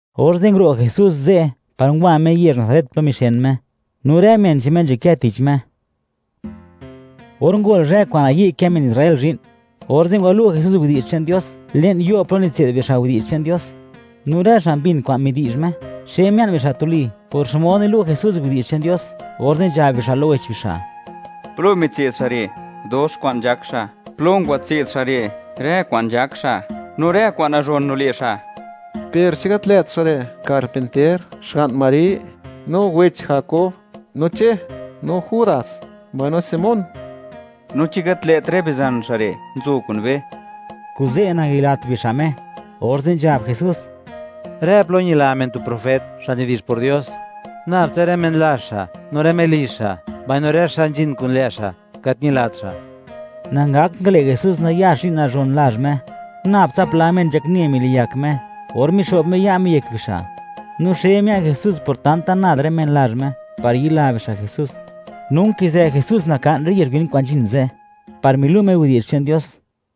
Orze' nguro' Jesús ze' par ngwa Me yezh Nazaret plo mixen Me, no rë men che'n Me nzhakë tich Me. Or ngol zhë kwa'n nayi' kë men Israel zhi'n, orze' ngwalu' Jesús widi'zh che'n Dios le'n yo' plo nitse'd bixa' widi'zh che'n Dios. No rë xa' mbin kwa'n midi'zh Me, xe mia'n bixa' tuli por xmod nilu' Jesús widi'zh che'n Dios, orze' nzhab bixa' lo wech bixa': ―¿Plo ngwatse'd xa' re', dox kwa'n nzhak xa'? ¿Plo ngwatse'd xa' rë kwa'n nzhak xa' re', no rë kwa'n nazhon nile' xa'? ¿Per chi gat lë't xa' re' karpinter, xga'n Mari; no wech Jakob, no Che, no Judas, mbaino Simón? No, ¿chi gat lë't rë bizan xa' re', nzo kun be? Kuze', nangayilat bixa' Me. Orze' nzhab Jesús: ―Rë plo ñila men tu profet, xa' nidi'zh por Dios. Nabtsa rë men lazh xa', no rë melizh xa', mbaino rë xa' nzhin kun lë' xa' gat ñilat xa'. Nangakt ngale' Jesús nayax zhi'n nazhon lazh Me. Nabtsa pla men nzhakne miliyak Me or mixo'b Me ya' Me yek bixa'. No xe mia'n Jesús por tanta nad rë men lazh Me, par yila bixa' Jesús. No nkizë Jesús naka'n rë yezh win kwa'n nzhin ze', par milu' Me widi'zh che'n Dios.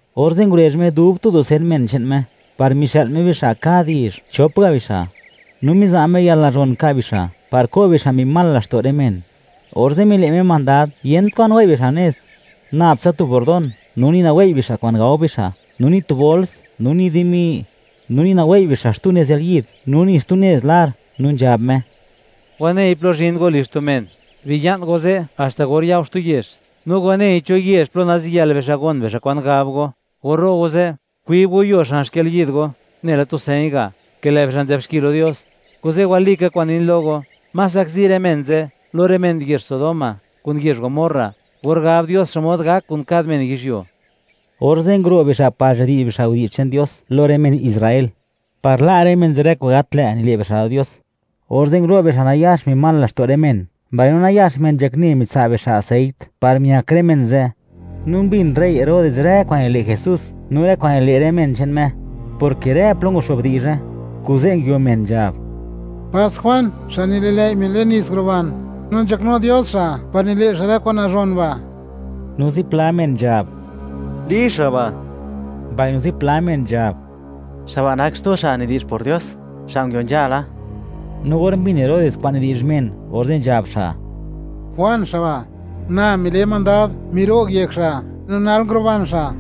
Orze' ngurezh Me dub tu dusen men che'n Me, par mixë'l Me bixa' kad yezh, chop ga bixa'; no miza' Me yalnazhon ka' bixa' par ko' bixa' mbi mal laxto' rë men. orze' mile' Me mandad, yent kwa'n wei' bixa' nez; nab tsa tu bordón; no ni nawei' bixa' kwa'n gao bixa', no ni tu bols, no ni dimi; no ni nawei' bixa' xtu nez yalyid, no ni xtu nez lar. No nzhab Me: ―Wanei plo zhin go lizh tu men, biya'n go ze' haxta or ya go xtu yezh. No wanei cho yezh plo naziyël bixa' gon bixa' kwa'n gab go; or ro' go ze', kwib go yuo xan xkalyid go, nela tu señ ga', ke lë' bixa' nzë'b xki lo Dios. (Kuze' walika kwa'n nin lo go, más zakzi rë men ze' lo rë men yezh Sodoma kun yezh Gomorra, or gab Dios xmod gak kun kad men yizhyuo.) Orze' nguro' bixa' par nzhadi'zh bixa' widi'zh che'n Dios lo rë men Israel, par la' rë men ze' rë kwa'n gat lë' nile' bixa' lo Dios. Orze' ngulo' bixa' nayax mbi mal laxto' rë men, mbaino nayax men nzhakne mitsa' bixa' aseit, par miak rë men ze'. No mbin rey Herodes rë kwa'n nile' Jesús no rë kwa'n nile' rë men che'n Me, porke rë plo nguxo'b di'zhe, kuze' nguio men nzhab: —Pas Juan xa' nili'lëi' men le'n nits, nguruban, no nzhaknu Dios xa' par nile' xa' rë kwa'n nazhon ba'. No zipla men nzhab: —Li xa' ba'. Mbaino zipla men nzhab: —Xa' ba' xa' nak xtu xa' nidi'zh por Dios, xa' nguio nzhala. No or mbin Herodes kwa'n nidi'zh men, orze' nzhab xa': ―¡Juan xa' ba'! ¡Na mile mandad miro'g yek xa', no nal nguruban xa'!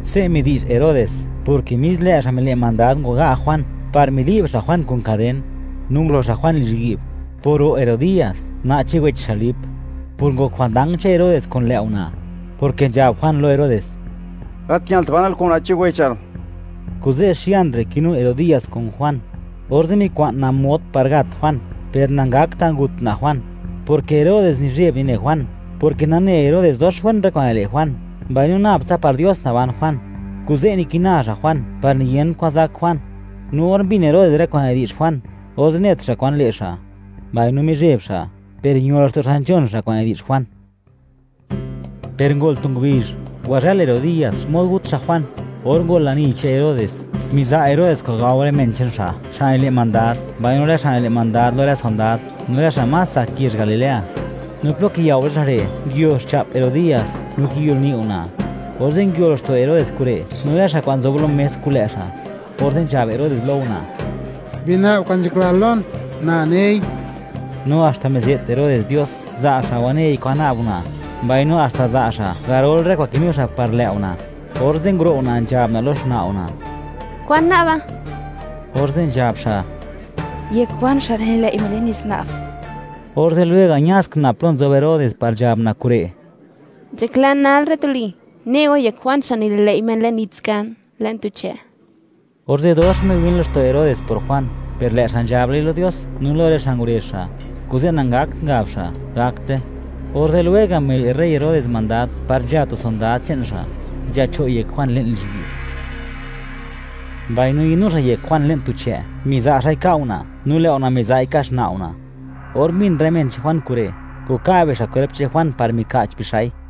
Se' midi'zh Herodes, porke mis lë' xa' mile' mandad ngwaga' Juan par mili'b xa' Juan kun kaden, no ngulo xa' Juan lizhyi'b, por ro' Herodías, una' che'n wech xa' Lip, por ngok jwandang che'n Herodes kun lë' una', porke nzhab Juan lo Herodes: “Gat ñalt, banal kun una' che'n wechal”, kuze' xian re' kinu Herodías kun Juan, orze' mikwa'n una' mod par gat Juan, per nangakta' ngut una' Juan, porke Herodes nizheb nine Juan, porke nane Herodes dox wen rë kwa'n nile' Juan, mbaino nab tsa par Dios naban Juan. Kuze' nikina xa' Juan par niyent kwan zak Juan. No or mbin Herodes rë kwa'n nidi'zh Juan, orze' net xa' kwan le' xa', mbaino mizheb xa', per ño laxto' xa' nzhon xa' kwa'n nidi'zh Juan. Per ngol tu ngubizh, ngwazhël Herodías xmod gut xa' Juan. Or ngol lani che'n Herodes, miza' Herodes kwa'n gao rë men che'n xa', xa' nile' mandad, mbaino rë xa' nile' mandad lo rë sondad, no rë xa' más tsak yezh Galilea. No plo kiyao rë xa' re', nguio xcha'p Herodías no kiyolni' una'. Orze' nguio laxto' Herodes kure', no rë xa' kwa'n nzob lo mes kun lë' xa', orze' nzhab Herodes lo una': —Bina'b kwa'n nzhaklal lon, na nei. No haxta mize't Herodes Dios, za' xa' wanei kwan na'b una', mbaino haxta za' xa' garol rë kwa'n kinu xa' par lë' una'. Orze' nguro' una', nzhab una' lo xna' una': ―¿Kwan na'ba? Orze' nzhab xa': ―Yek Juan xa' nililëi' men le'n nits nguna'b. Orze' lwega' ña ska una' plo nzob Herodes par nzhab una' kure': ―Nzhaklan nal re' tuli, ne' go yek Juan xa' nili'lëi' men le'n nits kan; le'n tu che'. Orze' dox miwin laxto' Herodes por Juan, per lë' xa' nzhablai lo Dios, no lo rë xa' ngurezh xa', kuze' nangakt ngab xa': “Gakte.” Orze' lwega' mile' rey Herodes mandad par nzha tu sondad che'n xa', nzhacho' yek Juan le'n lizhyi'b, mbaino ñadnu xa' yek Juan le'n tu chë', miza' xa'i ka' una', no lë' una' miza'i nka' xna' una'. Or mbin rë men che'n Juan kure', ngwaka' bixa' kwerp che'n Juan par mika'ch bixa'i.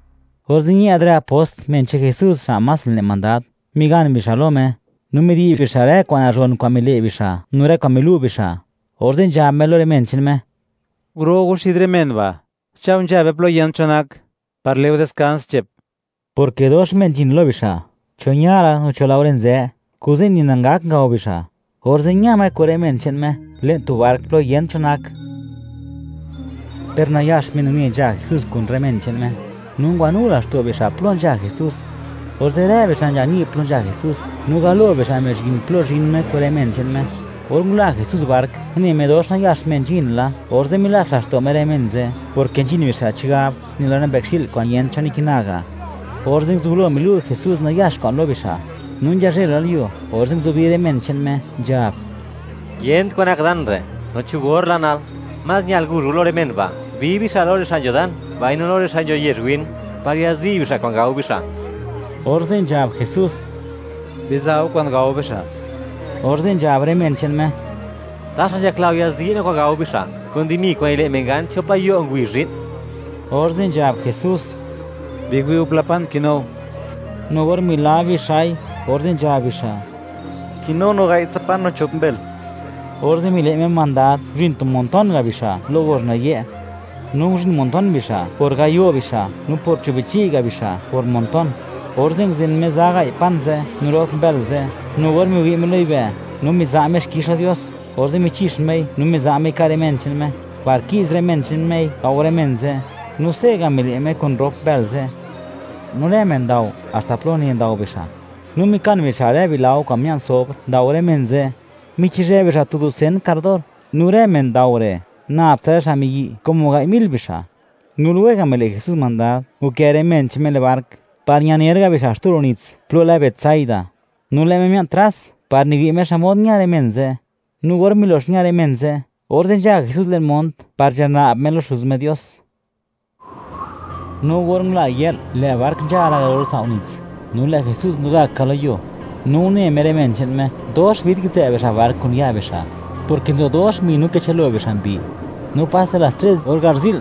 Orze' ñë'd rë apost, men che'n Jesús xa' más nile' mandad, migan bixa' lo Me, no midi'zh bixa' rë kwa'n nazhon kwa'n mile' bixa', no rë kwa'n milu' bixa', orze' nzhab Me lo rë men che'n Me: ―Guro' go xid rë men ba'; cha' go nzha be plo yent cho nak, par le' go diskans che'p. Porke dox men nzhin lo bixa', cho ña la, no cho laore nzë; kuze' ni nangak ngao bixa'. Orze' ña Me kun rë men che'n Me le'n tu bark, plo yent cho nak. Per nayax men une nzha Jesús kun rë men che'n Me, no ngwanu laxto' bixa' plo nzha Jesús. Orze', rë bixa' nzha ni' plo nzha Jesús, no galo bixa' mizhin plo zhin Me kun rë men che'n Me. Or ngula Jesús bark, une Me dox nayax men nzhin la, orze' milats laxto' Me rë men ze', porke nzhin bixa' chigab nela rë mbëkxi'l kwa'n yent cho nikina ga'. Orze' nguzublo milu' Jesús nayax kwa'n lo bixa'. No nzhazhëlalyuo, orze' nguzubi rë men che'n Me, nzhab: ―Yent kwa'n nak dan re', no cho or la nal. Más ñal guzh go lo rë men ba', bi bixa' lo rë xa' nzho dan mbaino lo rë xa' nzho yezh win, par yazi' bixa' kwa'n gao bixa'. Orze' nzhab Jesús: ―¡Biza' go kwa'n gao bixa'! Orze' nzhab rë men che'n Me: ―¿Taxa nzhakla go yazi' no kwa'n gao bixa', kun dimi kwa'n nile' men gan chop gayo' ngubizh zhi'n? Orze' nzhab Jesús: ―Biwi' go pla pan kinu go. No or milab bixa'i, orze' nzhab bixa': ―Kinu no ga'ytsa pan, no chop mbël. Orze' mile' Me mandad, nguzhin tu montón ga' bixa', lo gozh nayë'. No nguzhin montón bixa', por gayo' bixa', no por cho' bichi' ga' bixa', por montón. Orze' nguzen Me za gai' pan ze' no rop mbël ze', no or miwi' Me lo yibë', no miza' Me xkix lo Dios, orze' michi'x Mei, no miza' Mei ka' rë men che'n Me, par ki'z rë men che'n Mei gao rë men ze'. No se'ga' mile' Me kun rop mbël ze'. No rë men ndao haxta plo une ndao bixa'. No mikan bixa' rë bilao kwa'n mia'n sobr ndao rë men ze'; michizhë bixa' tu dusen kardor. No rë men ndao re', nab tsa rë xa' miyi', como gai' mil bixa'. No lwega' mile' Jesús mandad, nkë rë men che'n Me le'n bark, par ñaner ga' bixa' xtu ro' nits plo lë Betsaida; no lë' Me mia'n tras par miwi' Me xmod ña rë men ze'. No or milox ña rë men ze', orze' nzha Jesús le'n mont par nzhana'b Me lo Xuz Me Dios. No or ngula yë'l, lë' bark nzha la garol sao' nits, no lë' Jesús nzo gak ka lo yuo. No une Me rë men che'n Me, dox vid kitsë' bixa' bark kun ya' bixa', porke nzo dox mbi no kichë'l-lo bixa' mbi. No paste las tres or garzi'l,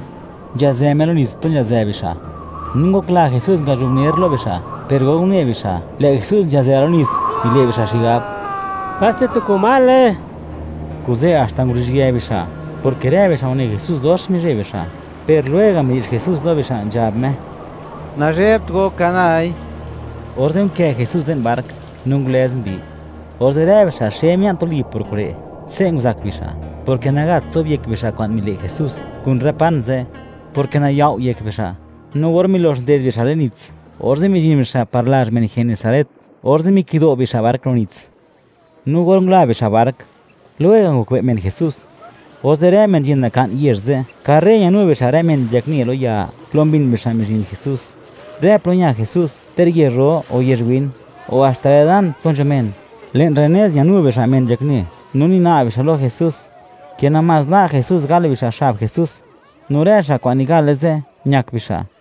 nzhazë Me lo nits plo nzhazë bixa'. No ngokla Jesús, ngazhubner lo bixa'. Per or une bixa', lë' Jesús nzhazë lo nits, mile' bixa' xigab: “¡Paste tu komale!”, kuze' haxta nguruzhië bixa', porke rë bixa' une Jesús, dox mizheb bixa', per lwega' midi'zh Jesús lo bixa', nzhab Me: ―¡Nazhebt go! ¡Ka nai! Orze' nkë Jesús le'n bark, no ngulëz mbi. Orze' rë bixa' xe mia'n tuli por kure'. Se' nguzak bixa', porke nagat zobyek bixa' kwa'n mile' Jesús kun rë pan ze'; porke nayao' yek bixa'. No or milox nded bixa' le'n nits, orze' mizhin bixa' par lazh men Genesaret, orze' mikido' bixa' bark ro' nits. no or ngula bixa' bark, lwega' ngokbe' men Jesús, orze' rë men nzhin naka'n yezh ze', karre ñanu bixa' rë men nzhakne lo ya, plo mbin bixa' mizhin Jesús. Rë plo ña Jesús, ter yezh ro o yezh win, o haxta rë dan plo nzho men; le'n rë nez ñanu bixa' men nzhakne, no nina'b bixa' lo Jesús ke namás la' Jesús gal bixa' xab Jesús. No rë xa' kwa'n nigale ze', ñak bixa'.